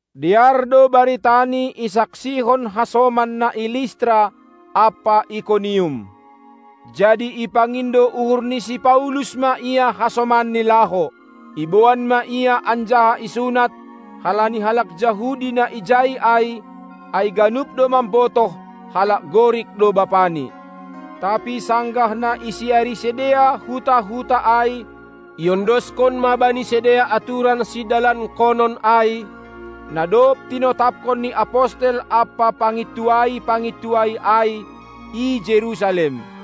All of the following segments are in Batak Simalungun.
Dear do baritani isaksihon hasoman na i Listra ampa Ikonium. Jadi ipangindo uhur ni si Paulus ma ia hasomanni laho. Iboan ma ia anjaha isunat, halani halak Jahudi na ijai ai, ai ganup do mambotoh halak Gorik do bapani. Tapi sanggah na isiari sidea huta-huta ai, iondoskon ma bani sidea aturan sidalankonon ai, na dob tinotapkon ni apostel ampa pangintuai-pangintuai ai i Jerusalem.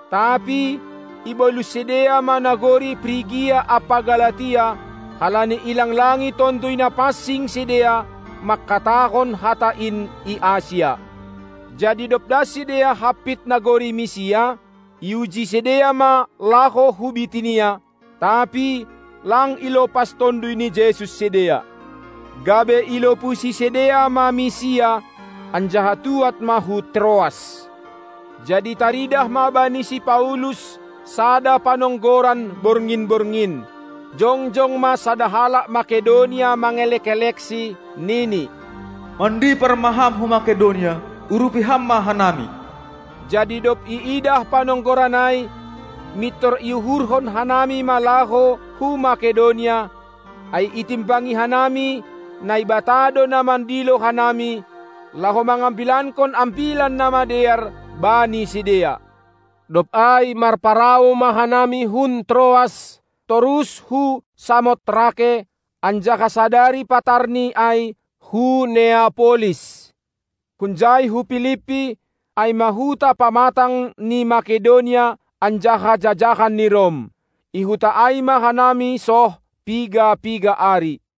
Tapi ibolus sidea ma nagori Prigia ampa Galatia, halani ilanglangi Tonduy Napansing sidea mangkatahon hata in i Asia. Jadi dob das sidea hampit nagori Misia, iuji sidea ma laho hu Bitinia, tapi lang ilopas Tonduy ni Jesus sidea. Gabe ilopusi sidea ma Misia, anjaha tuad ma hu Troas. Jadi taridah ma bani si Paulus sada panonggoran borngin-borngin. Jongjong ma sada halak Makedonia mangelek-eleksi, nini: Mandipar ma ham hu Makedonia, urupi ham ma hanami! Jadi dob iidah panonggoran ai, mintor iuhurhon hanami ma laho hu Makedonia, ai itimbangi hanami, Naibata do na mandilo hanami, laho mangambilankon Ambilan Namadear bani sidea. Dob ai marparau ma hanami hun Troas torus hu Samotrake, anjaha sadari patarni ai hu Neapolis. Hunjai hu Pilippi, ai ma huta pamatang ni Makedonia anjaha jajahan ni Rom. I huta ai ma hanami soh piga-piga ari.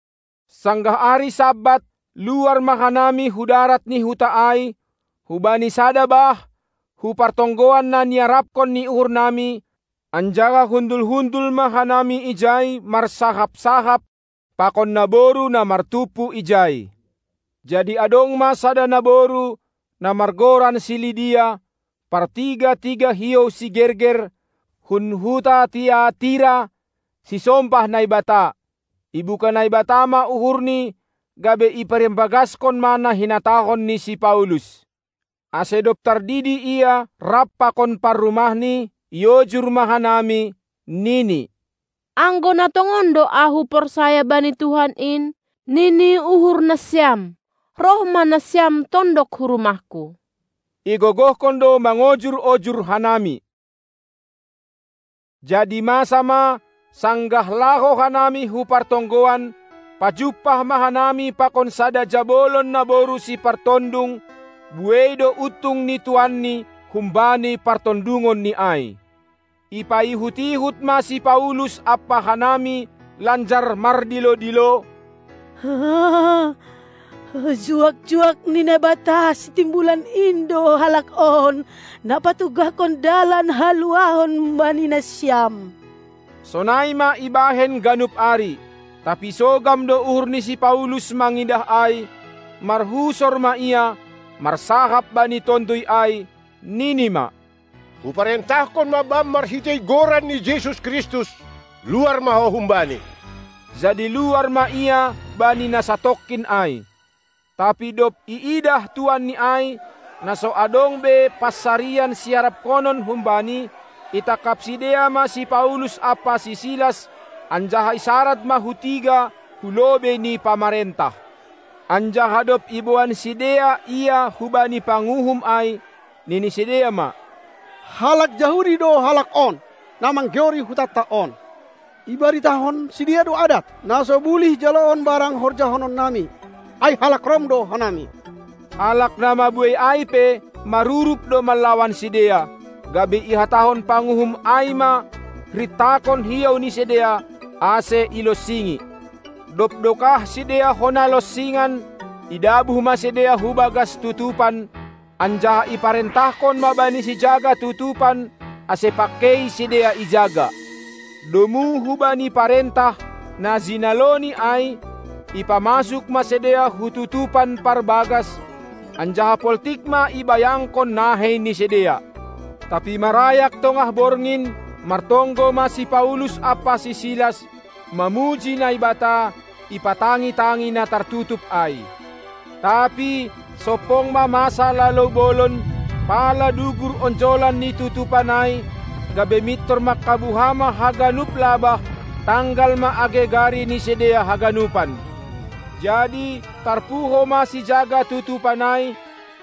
Sanggah ari Sabat luar ma hanami hu darat ni huta ai, hubani sada bah; hu partonggoan na niarapkon ni uhurnami, anjaha hundul-hundul ma hanami ijai marsahap-sahap pakon naboru na martumpu ijai. Jadi adong ma sada naboru, na margoran si Lidia, partiga-tiga hiou sigerger, hun huta Tiatira, sisombah Naibata. Ibuka Naibata ma uhurni gabe iparimbagaskon ma na hinatahon ni si Paulus. Ase dob tardidi ia rap pakon parrumahni, iojur ma hanami, nini: Anggo na tongon do ahu porsaya bani Tuhan in, nini uhurnasiam, roh ma nasiam tondok hu rumahku. Igogohkon do mangojur-ojur hanami. Jadi masa ma, sanggah laho hanami hu partonggoan, pajumpah ma hanami pakon sada jabolon naboru sipartondung; buei do untung ni tuanni humbani partondungonni ai. Ipaihut-ihut ma si Paulus ampa hanami lanjar mardilo-dilo: Juak-juak ni Naibata Sitimbulan in do halak on, na patugahkon dalan haluahon bani nasiam! Sonai ma ibahen ganup ari. Tapi sogam do uhur ni si Paulus mangidah ai, marhusor ma ia, marsahap bani tonduy ai, nini ma: Huparentahkon ma bam marhitei Goran ni Jesus Kristus, luar ma ho humbani. Jadi luar ma ia bani na satongkin ai. Tapi dob iidah tuanni ai, na so adong be pansarian siaraphonon humbani, itangkap sidea ma si Paulus ampa si Silas anjaha isarad ma hu tiga hu lobei ni pamarentah. Anjaha dob iboan sidea ia hubani panguhum ai, nini sidea ma: Halak Jahudi do halak on, na manggeori hutanta on. Ibaritahon sidea do adat, na so bulih jaloon barang horjahonon nami, ai halak Rom do hanami. Halak na mabuei ai pe marurup do manlawan sidea, gabe ihatahon panguhum ai ma rintakon hiou ni sidea, ase ilonsingi. Dob dokah sidea hona lonsingan, idabuh ma sidea hu bagas tutupan, anjaha iparentahkon ma bani sijaga tutupan, ase pangkei sidea ijaga. Domu hubani parentah, na jinaloni ai, ipamasuk ma sidea hu tutupan parbagas, anjaha poltik ma ibayangkon nahei ni sidea. Tapi marayak tongah borngin, martonggo ma si Paulus ampa si Silas mamuji Naibata ipatangi-tangi na tartutup ai. Tapi sompong ma masa lalou bolon, pala dugur onjolan ni tutupan ai, gabe mintor mangkabuha ma haganup labah, tanggal ma age gari ni sidea haganupan. Jadi tarpuho ma sijaga tutupan ai,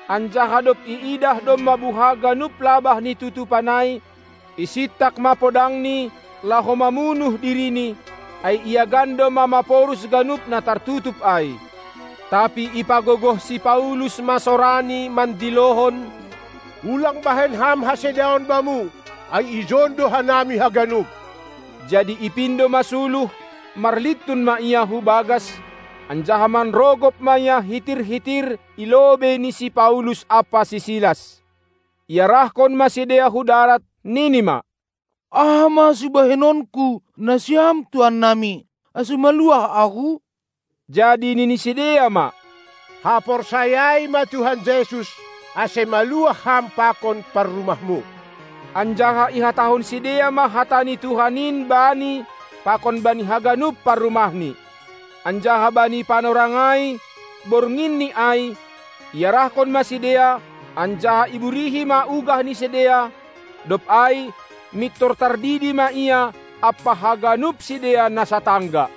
anjaha dob iidah domma buha ganup labah ni tutupan ai, isintak ma podangni laho mamunuh dirini, ai iagan domma maporus ganup na tartutup ai. Tapi ipagogoh si Paulus ma sorani mandilohon: Ulang bahen ham hasedaon bamu, ai ijon do hanami haganup! Jadi ipindo ma suluh, marlintun ma ia hu bagas, anjaha manrogop ma ia hitir-hitir i lobei ni si Paulus ampa si Silas. Iarahkon ma sidea hu darat, nini ma: Aha ma sibahenonku, nasiam tuannami, ase maluah ahu? Jadi nini sidea ma: Haporsayai ma Tuhan Jesus, ase maluah ham pakon parrumahmu! Anjaha ihatahon sidea ma hata ni Tuhan in bani pakon bani haganup parrumahni. Anjaha bani panorang ai, bornginni ai, iarahkon ma sidea anjaha iburihi ma ugah ni sidea; dob ai mintor tardidi ma ia ampa haganup sidea na satangga.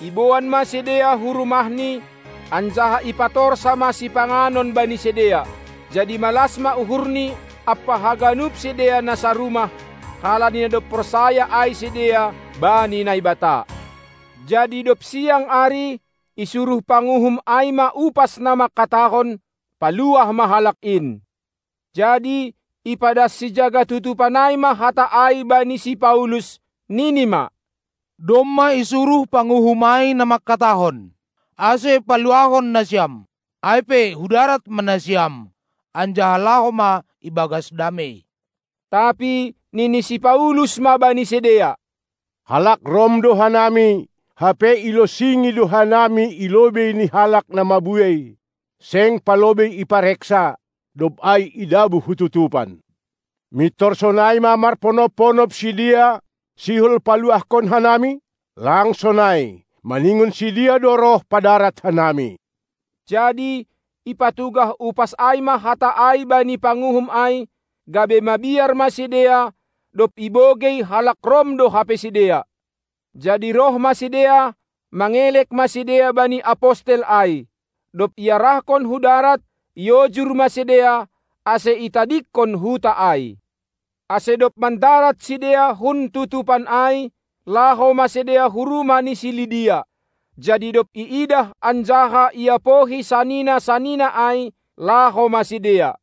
Iboan ma sidea hu rumahni, anjaha ipatorsa ma sipanganon bani sidea. Jadi malas ma uhurni ampa haganup sidea na sarumah, halani na dob porsaya ai sidea bani Naibata. Jadi dob siang ari, isuruh panguhum ai ma upas na mangkatahon: Paluah ma halak in! Jadi ipadas sijaga tutupan ai ma hata ai bani si Paulus, nini ma: Domma isuruh panguhum ai na mangkatahon, ase paluahon nasiam. Ai pe hu darat ma nasiam, anjaha laho ma ibagas damei! Tapi nini si Paulus ma bani sidea: Halak Rom do hanami, hape ilonsingi do hanami i lobei ni halak na mabuei, seng palobei ipareksa, dob ai idabuh hu tutupan. Mintor sonai ma marponop-ponop sidea, sihol paluahkon hanami? Lang sonai, maningon sidea do roh padarat hanami! Jadi ipatugah upas ai ma hata ai bani panguhum ai, gabe mabiar ma sidea dob ibogei halak Rom do hape sidea. Jadi roh ma sidea, mangelek ma sidea bani apostel ai. Dob iarahkon hu darat, iojur ma sidea, ase itadingkon huta ai. Ase dob mandarat sidea hun tutupan ai, laho ma sidea hu rumah ni si Lidia. Jadi dob iidah anjaha iapohi sanina-sanina ai, laho ma sidea.